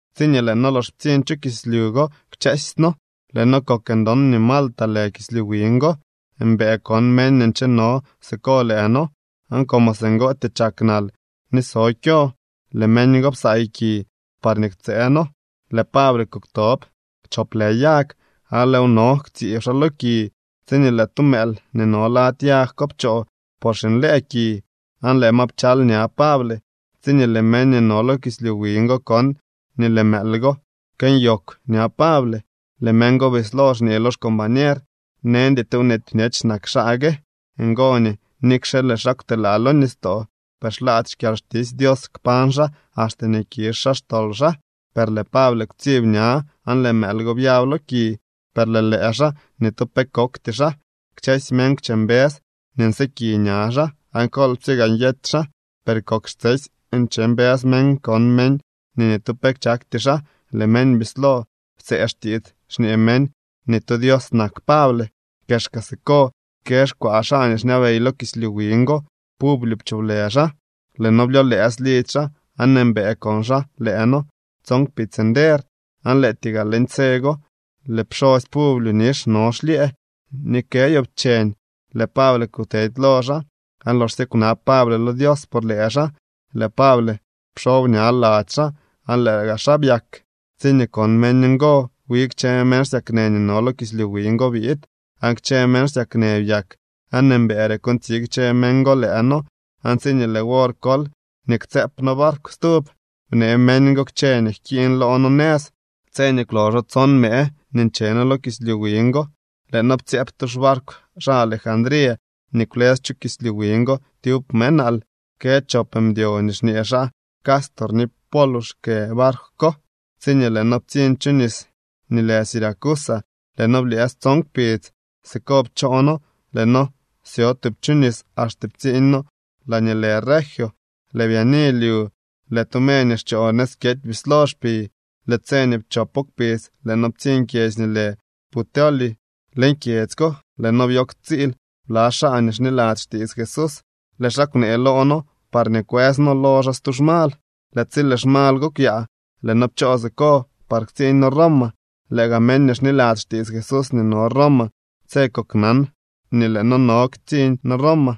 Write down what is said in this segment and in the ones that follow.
Tsiñee lëë noo lox ptsiñ chu kislyu go kchësy noo, lëë noo kok ndon nii Malta lë kislyu wiñ go. Mbëë kon meñ nii ncheno siko lëë noo, aan como singootyee chak nal ni so kyo, lëë meñ go psaay ki parñee ktsëë noo. Lëë Pable kuktop chop lë yag, aan lëëw no ktsiib xaa lo ki, tsiñee lëë tu mëël nii no lady yag pchoo por xinlëë ki, aan lëë ma pchal ña Pable. Tsiñee lëë meñ nii no lo kislyu wiñ go kon nii lëë mëël go kënyoogw ña Pable, lëë meñ go bislo xñee lo xcombañer: —Neñdy tu nweety bñech nak xaa gue. Ngo nii nikxe lëë xaa kwtelaa lo nistoo, per xlaady xkyalxtisy Dios kpañ xaa axte nii kizh xaa xtol xaa. Per lëë Pable kwtsib ña aan lëë mëël go byab lo ki, per lëë lëë xaa, ni tu pe kokty xaa. Kchësy meñ kwche mbës nii nsyëki ña xaa o kolpsye gaa nyety xaa. Per kok xtsesy nche mbës meñ kon meñ nii ni tu pe chakty xaa. Lëë meñ bislo ptsëë xtiits, xñee meñ nii tu dios nak Pable. Kexka siko kë xkwaa xaa nii xñabey lo kislyu wiñ go. Publio pcholë xaa. Lëë noo byolëës lidzy xaa aan mbëë kon xaa lëë noo tson kpidz nder. Aan lëëtyee gaa leñ tse go lëë pxosy Publio nix no xlyëë ni kë yoobcheñ. Lëë Pable kutedy lo xaa, aan loxsye kwnab Pable lo Dios por lëë xaa, lëë Pable pxob ña lady xaa aan lëë gaa xaa byak. Tsiñee kon meñ ngo, wi kchë meñ xsyaknë nii no lo kislyu wiñ go biid, aan kchë meñ xsyaknë byak. Aan mbëëre kontsi kchë meñ lëë noo, aan tsiñee lëë wor kol nii ktsëëp noo barkw stub, bnee meñ go kchë nii jkiiñ loo noo nëz. Tse nii kwloxo tson mëë nii nche noo lo kislyu wiñ go, lëë noo ptsyëëp tu xbarkw xaa Alejandría nii kwlës chu kislyu wiñ go tyub mëë nal. Kë chop mdyo nii xñee xaa Cástor ni Pólux kë barkw ko. Tsiñee lëë noo ptsiñ chu nis nii lë Siracusa, lëë noo blyëës tson kpidz. Siko pchoo noo lëë noo syo tub chu nis axte ptsiiñ noo laañee lë Regio. Lëë byaani lyu lëë tu me nii xchoo nëz kyety bislo xpi. Lëë tse nii pchopo kpidz lëë noo ptsiñ kyedzy nii lë Puteoli. Leñ kyedzy ko lëë noo byo ktsiil bla xaa nii xniladzy xtiits Jesús. Lëë xaa kwnee loo noo parñee kwëës noo lo xaa tu xmal. Lëë tsi lëë xmal go kwyaa lëë noo pchoo siko par ktsiiñ noo Roma. Lëë gaa meñ nii xniladzy xtiits Jesús nii no Roma tse koknan nii lëë noo no nëz ktsiiñ noo Roma.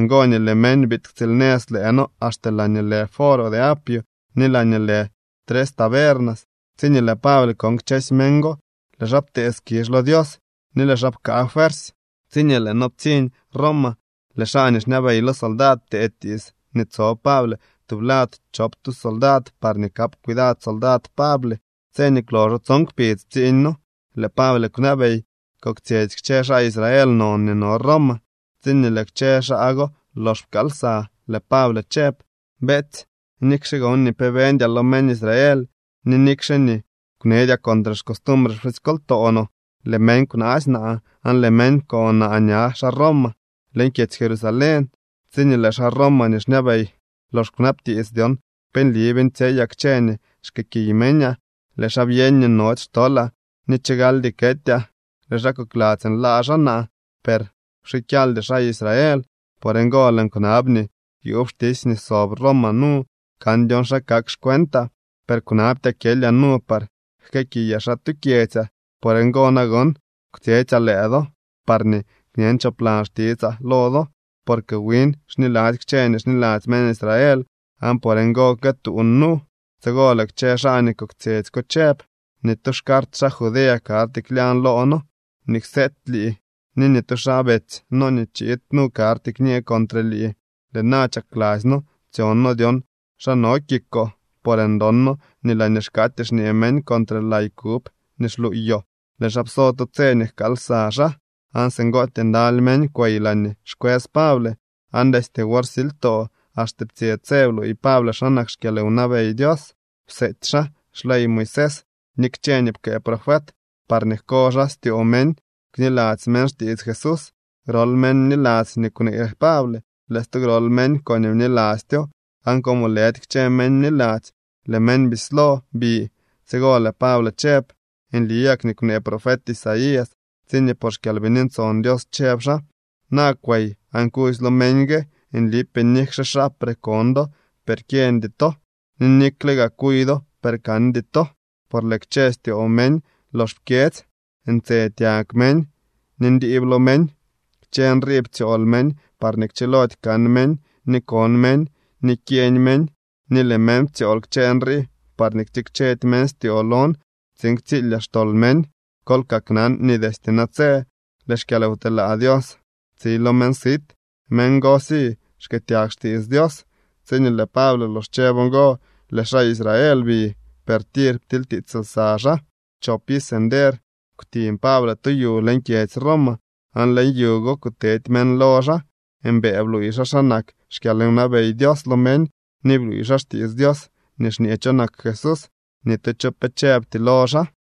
Ngo nii lëë meñ biid ktsiilnëz lëë noo axte laañee lë Foro de Apio ni laañee lë Las Tres Tabernas. Tsiñee lëë Pable kon kchësy meñ go, lëë xaa ptee skizh lo Dios ni lëë xaa pkaa fuersy. Tsiñee lëë noo ptsiñ Roma, lëë xaa nii xñabey lo soldad ptee tiits nii tso Pable tublad chop tu soldad parñee kap cuidad soldad Pable. Tse nii kwloxo tson kpidz ptsiiñ noo, lëë Pable kwnabey koktsyetsy kchë xaa Israel non nii no Roma. Tsiñee lëë kchë xaa go lox pkaal lsa, lëë Pable chëb: —Beetsy, nikxe gon ni pe beñdyaa lo meñ Israel ni nikxe nii kwneedyaa contre xcostumbre pxusykoltoo no, lëë meñ kwnaasy naa aan lëë meñ pko naa ña xaa Roma leñ kyedzy Jerusalén. Tsiñee lëë xaa Roma nii xñabey lox kwnabtiits dyon pe nli beeñtsyeyaa kchë nii xkëëkiy meñaa, lëë xaa byeñ nii nody xtolaa ni chigaldy ketyaa. Lëë xaa kokladzy nlaa xaa naa. Per kwxikyaldy xaa Israel. Por ngo lëën kwnab nii yuub xtisy nii sob Roma nu kan dyon xa kak xcuentaa, per kwnabtyaa kyelyaa nu par jkëëkiyaa xaa tu kyedzyaa. Por ngo nagon kwtsyetsyaa lëë do parñee kñen choplan xtitsaa lo do. Porque win xniladzy kchë nii xniladzy meñ Israel aan por ngo këtuun nu. Tsigo lëë kchë xaa nii koktsyetsy ko chëb: —Ni tu xcart xaa Judea karty klyañ loo noo nii kseety lii, ni ni tu xaa betsy no nii chiid nu karty kñee contre lii. Lëë na chakladzy noo tsyon noo dyon xa no kikoo, por ndon noo nii laañee xkaatyee xñee meñ contre lay kub nii xluuyoo. Lëë xaa pso tu tse nii jkaal lsa xaa, aan singootyee ndaly meñ kwey laañee xkwës Pable. Aan destye wor silytoo axte ptsye tse bluuy Pable xa nak xkyalwnabey Dios. Pseety xaa xley Moisés ni kchë nii pkëë profet parñee jko xaa styoo meñ kniladzy meñ xtiits Jesús. Grol meñ bniladzy nii kwnee Pable, lëë stu grol meñ koñee bnilastyo. Aan como lëdy kchë meñ bniladzy, lëë meñ bislo bi. Tsigo lëë Pable chëb: —Nli gak nii kwnee profet Isaías tsiñee por xKyalbini Ntson Dios chëb xaa: Na kwey aan kudzy lo meñ gue: Nlipee nikxe xaapre kon do, per kyeñdy to, ni nikle gaa kuy do, per kandy to. Por lëë kchë styoo meñ lox pkyedzy, ntse tyag meñ, ni ndiib lo meñ. Kchë nrii ptsyool meñ parñee kchilody kan meñ, ni kon meñ, ni kyeñ meñ. Ni lëë meñ ptsyool kchë nrii parñee ktikchedy meñ styoo lon tsiin ktsilyaa xtol meñ. Kol kaknan nii destye natse lëë xkyalwtelaa Dios tsi lo meñ sit. Meñ gosy skëëtyag xtiits Dios. Tsiñee lëë Pable lox chëb ngo, lëë xaa Israel bi, per tir ptilytiits lsa xaa. Chop iz nder kwtiñ Pable tu yu leñ kyedzy Roma, aan leñ yu go kutedy meñ lo xaa. Mbëë bluuy xaa xa nak xkyalwnabey Dios lo meñ ni bluuy xaa xtiits Dios nii xñee cho nak Jesús. Ni tu cho pe chëbty lo xaa.